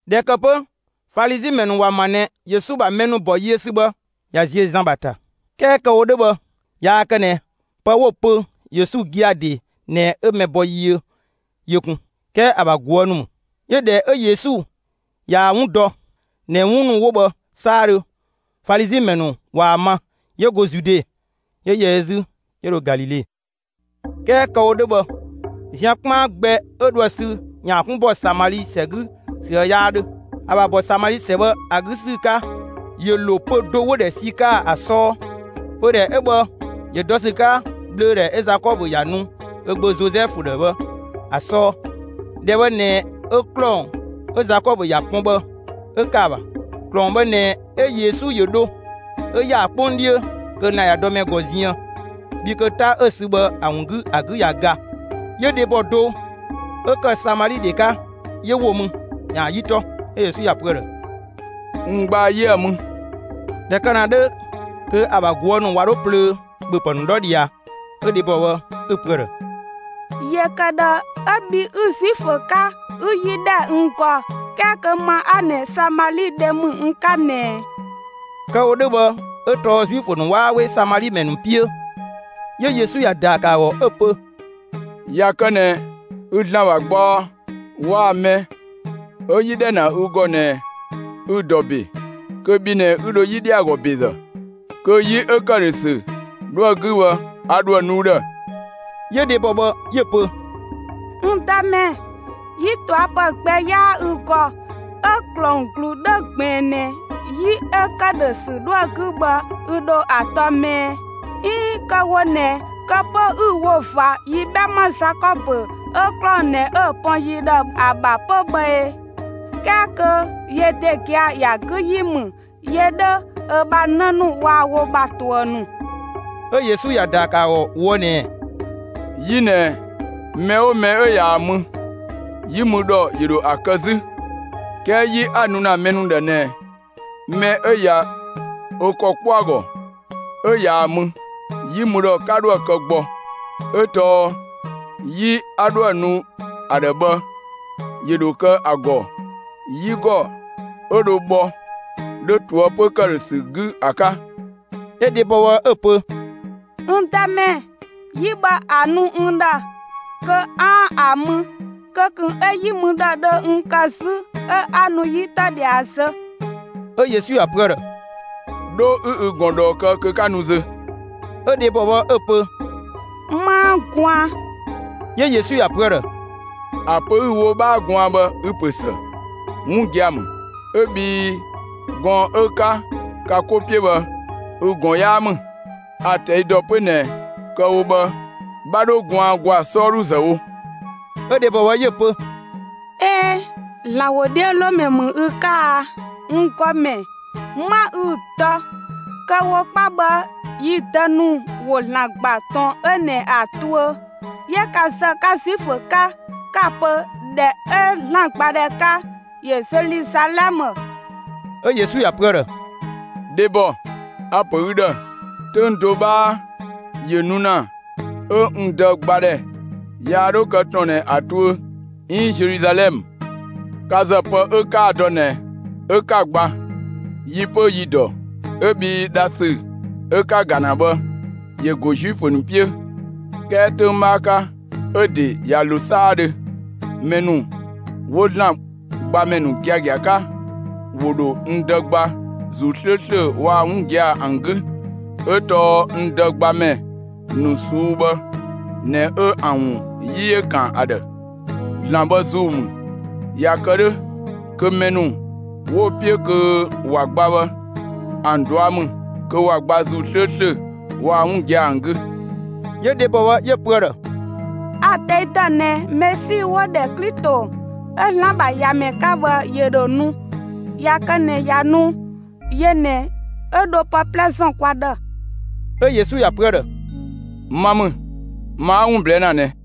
꞊Dhɛ ‑kë 'pö, Falizi ‑mɛ ‑nu ‑wa ‑ma ꞊nɛ Yesu ‑bha mɛ ‑nu ‑bɔ yiö ‑sü bhë, ꞊ya ziö Zan ‑bha ‑ta. 'Kɛɛ kë‑ wo 'dhö bhë, yaa kë ꞊nɛ pë 'wo‑ pö Yesu gia‑ ‑de ꞊nɛ 'ö mɛ bɔ yiö yö kun, 'kɛɛ ‑a ‑bha ꞊guë' ‑nu ‑mü. 'Yö ꞊dhɛ 'ö Yesu ꞊yaa‑ 'wun dɔ ꞊nɛ 'wun ‑nu 'wo bhë 'saadhö, Falizi ‑mɛ ‑nu ꞊waa‑ ma, 'yö go Zude, 'yö ‑yɛ ö 'zü, 'yö dho Galile. 'Kɛɛ kë‑ wo 'dhö bhë zian 'kpaan gbɛ 'ö dhoë sü ‑yaan 'kun ‑bɔ Samali ‑sɛ 'gü ‑süë 'yaa 'dhö. ‑A ‑bha ‑bɔ Samali ‑sɛ bhë ‑a 'gü ‑sü 'ka, ‑yö ‑lo pö‑ do 'wo‑ ‑dhɛ Sikaa ‑a 'sɔɔ. Pödhɛ 'ö bhë ‑yö dɔ ‑sü 'ka ꞊bhlöödhɛ 'ö Zakɔbö ‑ya nu ö gbö Zozɛfu ‑dhë bhë ‑a 'sɔɔ. ‑Dhɛ bhë ꞊nɛ 'ö ‑klɔng 'ö Zakɔbö ‑ya pɔn bhë 'ö ‑kë ‑a ‑bha. ‑Klɔng bhë ꞊nɛ 'ö Yesu ‑yö dho 'ö ‑ya ‑a 'kpong 'dhiö kö lan‑ ꞊ya dɔ mɛ ‑gɔ ziën, bhii kö 'ta 'ö‑ sü bhë ‑a ‑wun 'gü, ‑a 'gü ꞊ya ga. 'Yö dhebɔ do 'ö ‑kë Samali ‑dhe 'ka 'yö ‑wo mü ‑yaan 'yi 'tɔ. 'Ö Yesu ‑ya pö ‑a ‑dhë: «N gbaa 'yië 'a‑ mü!» ꞊Dhɛ kë ‑na 'dhö kö ‑a ‑bha ꞊guë' ‑nu ꞊wa 'dho plöö ‑bhöpë ‑nu 'dhɔ ꞊dhia. 'Ö dhebɔ bhë 'ö‑ pö ‑a ‑dhë: «‑Yö ‑kë ꞊dhë 'ö bhi 'ü Zuifö 'ka, 'ü 'yi ‑dhɛ n ‑gɔ, 'kɛɛ kö ma 'a ꞊nɛ Samali ‑dhe ‑mü n 'ka ꞊nɛ ꞊ɛ?» (Kë‑ wo 'dhö bhë 'ö tɔɔ Zuifö ‑nu 'waa 'we Samali ‑mɛ ‑nu 'piö.) 'Yö Yesu ‑ya ‑daa ‑kë ‑a ‑gɔ 'ö‑ pö: «꞊Ya kë ꞊nɛ ü ‑Zlan ‑bha gbaɔ waa‑ mɛ 'ö 'yi ‑dhɛ ‑na ü ‑gɔ ꞊nɛ ü‑ ‑dɔ ‑be, kö bhi ꞊nɛ 'ü dho 'yi ‑dhɛ ‑a ‑gɔ ‑bezë. Kö 'yi 'ö ‑këdhösü 'dhoë‑ 'gü bhë, a ‑dhoë nu ü ‑dhë.» 'Yö dhebɔ bhë 'yö‑ pö: «N Dëmɛ, 'yi ꞊tɔa' ‑pë gbɛ 'yaa ü ‑gɔ 'ö ‑klɔng ‑glu 'dhö ꞊gbiin ꞊nɛ 'yi 'ö ‑këdhösü 'dhoë‑ 'gü bhë ü ‑dho ‑a tɔ 'më ɛɛ? 'Iin kë‑ wo ꞊nɛ, kë 'pö 'ü‑ wo ꞊va yi 'bhɛma Zakɔbö 'ö ‑klɔng ꞊nɛ 'ö‑ pɔn yi ‑dhë ‑a ‑bha 'pö bhë ee? 'Kɛɛ kö yö ‑de gia‑ ‑ya 'gü ‑yi ‑mü yö 'dhö, ö ‑bha 'në ‑nu waa‑ wo ‑bha ‑tuë ‑nu.» 'Ö Yesu ‑ya ‑daa ‑kë ‑a ‑gɔ ꞊woë' ꞊nɛɛ: «'Yi ꞊nɛ, mɛ 'oo mɛ 'ö ꞊yaa‑ mü, 'yi mü ‑dhɔ ‑yö ‑dho ‑a kë 'zü; 'kɛɛ 'yi 'a‑ nu ‑na mɛ ‑nu ‑dhë ꞊nɛ, mɛ 'ö ꞊ya ö ‑kɔ 'kpɔ ‑a ‑gɔ 'ö ꞊yaa‑ mü, 'yi mü ‑dhɔ 'ka 'dhoë‑ kë gbɔ. 'Ö tɔɔ 'yi 'a 'dhoë‑ nu ‑a ‑dhë bhë, ‑yö ‑dho kë ‑a ‑gɔ 'yigɔ 'ö dho bhɔ 'dhö ꞊toëpö ‑këdhösü 'gü ‑a 'ka.» 'Ö dhebɔ bhë 'ö‑ pö: «N Dëmɛ, 'yi bhë ‑a nu n ‑dhë kö 'aan‑ ‑a mü, kö ꞊kun 'ö 'yi mü ‑dhɔ dhö n kë 'zü 'ö 'a nu 'yi tɔ ꞊dhia zö.» 'Ö Yesu ‑ya pö ‑a ‑dhë: «'Dho 'ü ü ꞊gɔn ꞊dhɔɔ kë kö 'ka nu zö.» 'Ö dhebɔ bhë 'ö‑ pö: «'Maa gwaan.» 'Yö Yesu ‑ya pö ‑a ‑dhë: «‑A pö 'ü‑ wo 'bhaa gwaan bhë, ü‑ ‑pö ‑së; 'wun gia‑ ‑mü, 'ö bhii gɔɔn‑ 'ö 'ka ka 'ko 'piö bhë, ü ꞊gɔn 'yaa ‑mü. A‑ ꞊tɛi' dɔ 'pö ꞊nɛ kë‑ wo bhë 'bha 'dho gwaan ‑gwaa 'sɔɔdhu ‑zë wo.» 'Ö dhebɔ bhë 'yö‑ pö: «꞊Ee, ‑Zlan ‑wodhiölomɛ ‑mü ü 'ka a, n ‑Gɔmɛ! 'Ma ü dɔ. Kë‑ wo 'kpa bhë yi dë ‑nu ‑wo ‑Zlan ‑gba, ‑tɔn 'ö ꞊nɛ ‑a tuö; 'yö ka ‑zë, 'ka Zuifö 'ka, 'ka‑ pö, ‑dhɛ 'ö ‑Zlan gbadhɛ 'ka, ‑yö Zeluzalɛmë.» 'Ö Yesu ‑ya pö ‑a ‑dhë: «Dhebɔ, a‑ ‑pö ü ‑dhë, 'töng do 'bhaa ‑yö nu ‑na 'ö n Dë gbadhɛ yaa 'dhö kë ‑tɔn ꞊nɛ ‑a tuö 'iin Zeluzalɛmë. Ka ‑zë pë 'ö 'kaa‑ dɔ ꞊nɛ 'ö 'ka‑ gba. Yi 'pö yi‑ ‑dɔ 'ö bhii dhasü 'ö 'ka‑ ‑ga ‑na bhë, ‑yö ‑go Zuifö ‑nu 'piö. 'Kɛɛ 'töng 'bhaa 'ka, 'ö‑ ‑de ꞊ya ‑lo 'saadhö, mɛ ‑nu 'wo ‑Zlan gbamɛ ‑nu giagia 'ka, ‑wo ‑dho n Dë gba ‑Zuu 'slööslö waa‑ 'wun giagia ‑an 'gü. 'Ö tɔɔ n Dë gbamɛ ‑nu ꞊suu'‑ bhë ꞊nɛ 'ö ‑an ‑wun 'yi ‑yö kan ‑a ‑dhë. ‑Zlan bhë ‑Zuu ‑mü. ꞊Ya kë 'dhö, kö mɛ ‑nu 'wo‑ 'piö kö ‑wa gba bhë, ‑an ꞊dua' ‑mü kö ‑wa gba ‑Zuu 'slööslö waa‑ 'wun giagia ‑an 'gü.» 'Yö dhebɔ bhë 'yö‑ pö ‑a ‑dhë: «A‑ ꞊tɛi' ‑dɔ ꞊nɛ Mesi 'wo‑ ‑dhɛ Klito 'ö ‑Zlan ‑bha ‑Yamɛ 'ka bhë, ‑yö ‑dho nu. ꞊Ya kë ꞊nɛ ꞊ya nu, yö ꞊nɛ 'ö ‑dho pë 'plɛ ‑zɔn kwa ‑dhë.» 'Ö Yesu ‑ya pö ‑a ‑dhë: «Ma ‑mü, ma 'a 'wun ꞊blɛɛ' ‑na ꞊nɛ!»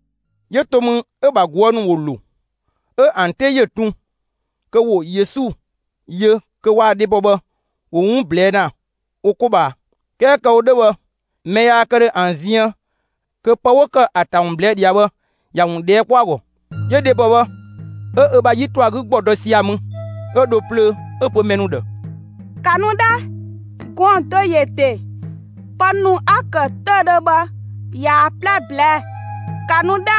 'Yö to mü 'ö‑ ‑bha ꞊guë' ‑nu ‑wo ‑lo; 'ö ‑an 'te ‑yö tun kö ‑wo Yesu yö kö waa‑ dhebɔ bhë ‑wo 'wun ꞊blɛɛ' ‑na wo 'ko ꞊bhaa. 'Kɛɛ kë‑ wo 'dhö bhë, mɛ yaa kë ‑dhö ‑an ziën kö pë 'wo ‑kë ‑a ‑ta ‑wun ꞊blɛɛ' ꞊dhia bhë, ‑ya ‑wun ꞊dhɛɛ' kpɔ ‑a ‑gɔ. 'Yö dhebɔ bhë, 'ö ö ‑bha 'yi ‑tɔ ‑a 'gü ‑gbɔ to sia‑ mü 'ö dho plöö 'ö‑ pö mɛ ‑nu ‑dhë: «‑Ka nu 'dhɛ! Gɔɔn‑ do ‑yö ‑de. Pë ‑nu 'a‑ ‑kë 'töüdhö bhë, ꞊yaa‑ 'plɛ ꞊blɛɛ'‑. ‑Ka nu 'dhɛ,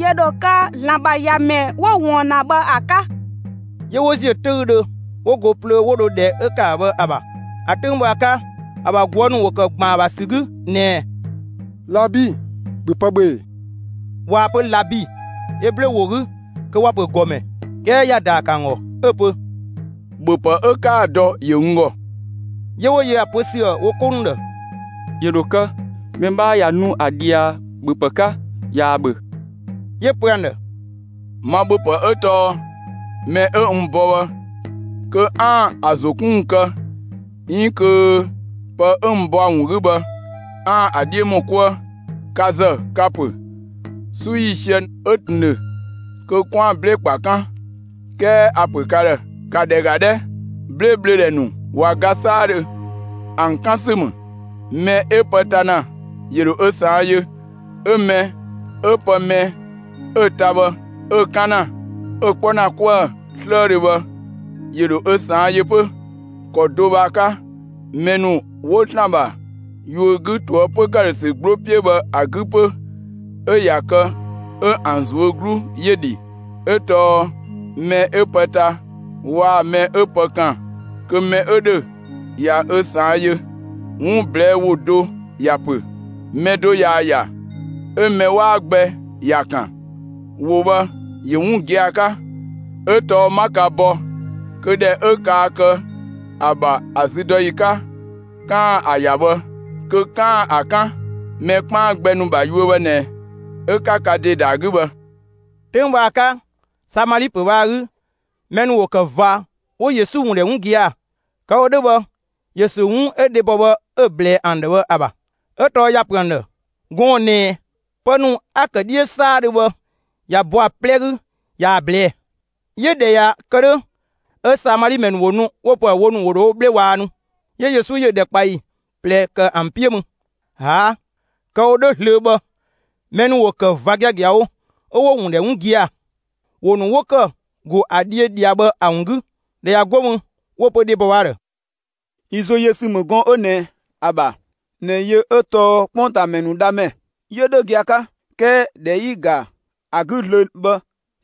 ‑yö ‑dho kë ‑Zlan ‑bha ‑Yamɛ 'wo‑ ꞊wɔɔn ‑na bhë ‑a 'ka.» 'Yö 'wo ‑ziö 'töüdhö, 'wo go plöö 'wo dho ‑dhɛ 'ö ‑kë ‑a ‑bha bhë ‑a ‑bha. ‑A 'töng bhë ‑a 'ka, ‑a ‑bha ꞊guë' ‑nu ‑wo ‑kë ‑gban ‑a ‑bha ‑sü 'gü ꞊nɛɛ: «Labi, ‑bhö pë ‑bhö ‑ee!» (꞊Waa‑ pö «Labi» Eblö ‑wo 'gü kö ‑wa ‑pö «‑Gɔmɛ».) 'Kɛɛ ‑ya ‑daa ‑kë ‑an ‑gɔ 'ö‑ pö: «‑Bhöpë 'ö 'kaa‑ dɔ ‑yö n ‑gɔ.» 'Yö 'wo yö ‑a pö ‑süë wo 'ko ‑nu ‑dhë: «‑Yö ‑dho kë, mɛ 'bhaa ꞊ya nu ‑a ꞊dhia ‑bhöpë 'ka, ꞊yaa‑ ‑bhö.» 'Yö‑ pö ‑an ‑dhë: «Ma ‑bhöpë 'ö tɔɔ mɛ 'ö n bɔ bhë kö 'aan‑ ‑a ‑zo 'kun ‑wun kë 'iin kö pë 'ö n bɔ ‑a ‑wun 'gü bhë, 'aan‑ ‑a 'dhiö ‑mɔ 'kuë. Ka ‑zë, ka‑ ‑pö: ‹'Su ‑yiisië 'ö ꞊tun ‑dhö kö 'kwaan‑ 'blee‑ ‑kpa 'kan›. 'Kɛɛ a‑ ‑pö ka ‑dhë: ‑Ka ‑dhɛ ‑ga 'dhɛ, 'blee‑ ꞊bhlödhɛ ‑nu ꞊wa ga 'saadhö; ‑an 'kan ‑sü ‑mü. Mɛ 'ö pë ta ‑na ‑yö ‑dho ö ꞊saan' yö. 'Ö mɛ 'ö pë 'ö mɛ bhë 'ö‑ ta bhë, 'ö‑ 'kan ‑na, 'ö‑ 'kpɔ ‑na 'kuë‑ 'slëëdhö bhë, 'yö dho ö ꞊saan' yö 'pö. ‑Kɔ do bhë 'ö‑ 'ka, mɛ ‑nu 'wo ‑Zlan ‑bha yuö 'gü ꞊toëpö ‑këdhösü 'gbloo 'piö bhë ‑a 'gü 'pö 'ö ꞊ya kë 'ö ‑an ꞊zuö' 'glu ‑yö dhi; 'ö tɔɔ mɛ 'ö pë ta waa‑ mɛ 'ö pë ‑kan kö mɛ 'ö ‑dhö ꞊ya ö ꞊saan' yö. 'Wun ꞊blɛɛ' ‑wo do ‑ya ‑pö: ‹Mɛ do ꞊yaa‑ ‑ya, 'ö mɛ 'waa gbɛ ‑ya ‑kan›. ‑Wo bhë ‑yö 'wun gia‑ 'ka. 'Ö tɔɔ 'ma ka bɔ kö ‑dhɛ 'ö kaa kë ‑a ‑bha ‑a züdɔyi 'ka, 'kaan‑ ‑a ‑ya bhë, kö 'kaan‑ ‑a 'kan. Mɛ 'kpaan gbɛ ‑nu ‑bha yuö bhë ꞊nɛ 'ö 'ka ka ‑de ‑da ‑a 'gü bhë.» 'Töng bhë ‑a 'ka, Samali ‑pö bhë ‑a 'gü ‑mɛ ‑nu ‑wo ‑kë ꞊va 'wo Yesu ‑wun ‑dhɛ 'wun gia‑; kë‑ wo 'dhö bhë, ‑yö ‑sü 'wun 'ö dhebɔ bhë 'ö‑ ꞊blɛɛ ‑an ‑dhë bhë ‑a ‑bha; 'ö tɔɔ ‑ya ‑pö ‑an ‑dhë: («Gɔɔn‑ ꞊nɛ,) pë ‑nu 'a‑ ‑kë 'dhiö 'saadhö bhë, ꞊ya bɔ ‑a 'plɛ 'gü ꞊yaa‑ ꞊blɛɛ'‑.» 'Yö ꞊dhɛ ꞊ya kë 'dhö, 'ö Samali ‑mɛ ‑nu ‑wo nu 'wo‑ pö ‑a ‑dhë wo ‑nu ‑wo wo 'bhle ꞊waannu. 'Yö Yesu ‑yö ‑dhɛkpaɔyi ꞊plɛ ‑kë ‑an 'piö mü. ‑Aa', kë‑ wo 'dhö zlöö bhë, mɛ ‑nu ‑wo ‑kë ꞊va giagiawo 'ö 'wo‑ ‑wun ‑dhɛ 'wun gia‑ ‑wo ‑nu 'wo ‑kë ‑go ‑a dhiö ꞊dhia bhë ‑a ‑wun 'gü. ꞊Dhɛ ꞊ya 'go mü, 'wo‑ pö dhebɔ bhë ‑a ‑dhë: «Yi ‑zo yö ‑sü ‑mü gɔɔn‑ 'ö ꞊nɛ ‑a ‑bha ꞊nɛ yö 'ö tɔɔ 'kpongtaamɛ ‑nu Dhamɛ; 'yö 'dhö gia‑ 'ka; 'kɛɛ ꞊dhɛ 'yi‑ ‑ga ‑a 'gü zlöö bhë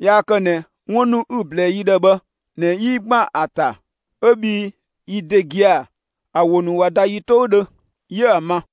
yaa kë ꞊nɛ 'wun ‑nu 'ü‑ ꞊blɛɛ yi ‑dhë bhë ꞊nɛ 'yi ‑gban ‑a ‑ta, 'ö bhii yi ‑de gia‑ ‑a ‑wo ‑nu ꞊wa ‑da yi 'toudhö, 'yië ‑an ma.»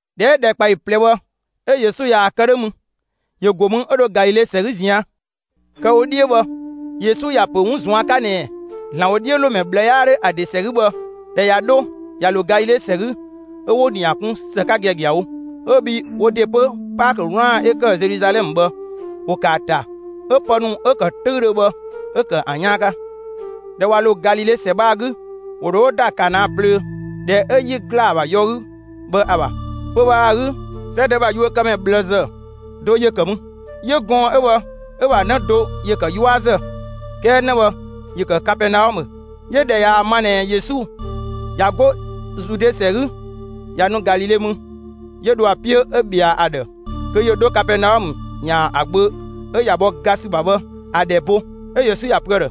꞊Dhɛ 'ö ‑dhɛkpaɔyi ꞊plɛ bhë, 'ö Yesu ꞊yaa‑ kë 'dhö mü, ‑yö ‑go mü 'ö dho Galile ‑sɛ 'gü ꞊zian'. Kë‑ wo 'dhiö bhë, Yesu ‑ya ‑pö 'wun ꞊zuan' 'ka ꞊nɛɛ: «‑Zlan ‑wodhiölomɛ ꞊bhlë 'yaa 'dhö ‑a ‑de ‑sɛ 'gü» bhë, ꞊dhɛ ꞊ya 'dho ꞊ya ‑lo Galile ‑sɛ 'gü, 'ö 'wo‑ ‑nia kun ‑së 'ka giagiawo, 'ö bhii wo ‑de 'pö, Paakö 'wlaan‑ 'ö ‑kë Zeluzalɛmë bhë, ‑wo ‑kë ‑a ‑ta 'ö pë ‑nu 'ö‑ ‑kë 'töüdhö bhë 'ö ‑kë ‑an 'yaan 'ka. ꞊Dhɛ ꞊wa ‑lo Galile ‑sɛ bhë ‑a 'gü, ‑wo ‑dho 'wo ‑da Kana plöö, ‑dhɛ 'ö 'yi ‑gla ‑a ‑bha yɔ 'gü bhë ‑a ‑bha. Pö‑ bhë ‑a 'gü, 'sɛdë ‑bha yuökëmɛ ꞊bhlëzë do ‑yö ‑kë mü. 'Yö gɔɔn‑ 'ö bhë 'ö‑ ‑bha 'në do ‑yö ‑kë 'yuazë; 'kɛɛ 'në bhë ‑yö ‑kë Kapɛɛnaɔmë. 'Yö ꞊dhɛ ꞊yaa‑ ma ꞊nɛ Yesu ꞊ya 'go Zude ‑sɛ 'gü ꞊ya nu Galile mü, 'yö dho ‑a 'piö 'ö ꞊bhɛa ‑a ‑dhë kö ‑yö 'dho Kapɛɛnaɔmë ‑yaan ö gbö 'ö ꞊ya bhɔ ga ‑sü ‑bha bhë ‑a ‑dhɛ bo. 'Ö Yesu ‑ya pö ‑a ‑dhë: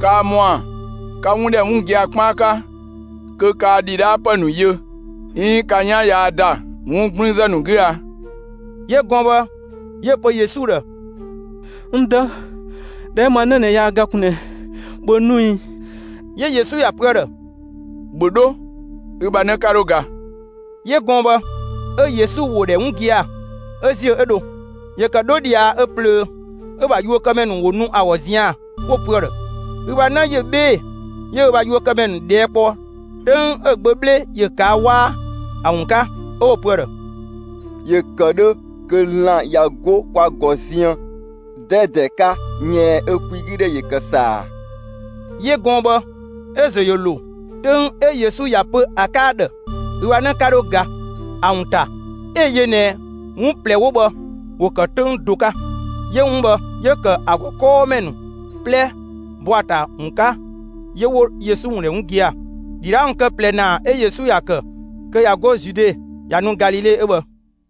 «Kaa ‑mɔa 'ka 'wun ‑dhɛ 'wun gia‑ 'kpaan 'ka kö kaa ‑dhidhaapë ‑nu yö 'iin ka 'yan yaa ‑da 'wun 'gblüünzë ‑nu 'gü a!» 'Yö gɔɔn‑ bhë 'yö‑ pö Yesu ‑dhë: «N dë, ‑dhɛ 'ö ma 'në yaa ga kun ꞊nɛɛ, ‑bhö nu ꞊ii!» 'Yö Yesu ‑ya pö ‑a ‑dhë: «‑Bhö 'dho, ü ‑bha 'në 'ka 'dho ga.» 'Yö gɔɔn‑ bhë, 'ö Yesu ‑wo ‑dhɛ 'wun gia‑, 'ö ‑ziö 'ö dho. ‑Yö ‑kë 'dho ꞊dhia ö ꞊plöö, 'ö‑ ‑bha yuökëmɛ ‑nu ‑wo nu ‑a ‑gɔ zian‑, 'wo‑ pö ‑a ‑dhë: «Ü ‑bha 'në ‑yö 'bhee‑!» 'Yö ö ‑bha yuökëmɛ ‑nu ꞊dhɛɛ' kpɔ 'töng 'ö‑ gbö 'bhle ‑yö ꞊kaa' 'waa, ‑a ‑wun 'ka; 'ö 'wo‑ pö ‑a ‑dhë: «‑Yö ‑kë 'dhö kö lan‑ ꞊ya 'go kwa ‑gɔ ziën 'dɛdɛ 'ka yɛɛn, 'ö‑ kwigüdhɛ ‑yö kë ‑saa.» 'Yö gɔɔn‑ bhë 'ö‑ ‑zo ‑yö ‑lo 'töng 'ö Yesu ‑ya pö ‑a 'ka ‑a ‑dhë: «ü ‑bha 'në 'ka 'dho ga» ‑a ‑wun ‑ta; 'ö‑ yö ꞊nɛ 'wun ꞊plɛ 'wo bhë ‑wo ‑kë 'töng do 'ka. 'Yö 'wun bhë 'yö ‑kë ‑a ‑gɔ 'kɔɔmɛ ‑nu 'plɛ ‑bɔ ‑a ‑ta ‑wun 'ka 'yö 'wo Yesu ‑wun ‑dhɛ 'wun gia‑. ‑Dhidhaa ‑wun kë ꞊plɛ ‑naa 'ö Yesu ‑ya ‑kë kö ꞊ya 'go Zude ꞊ya nu Galile 'ö bhë.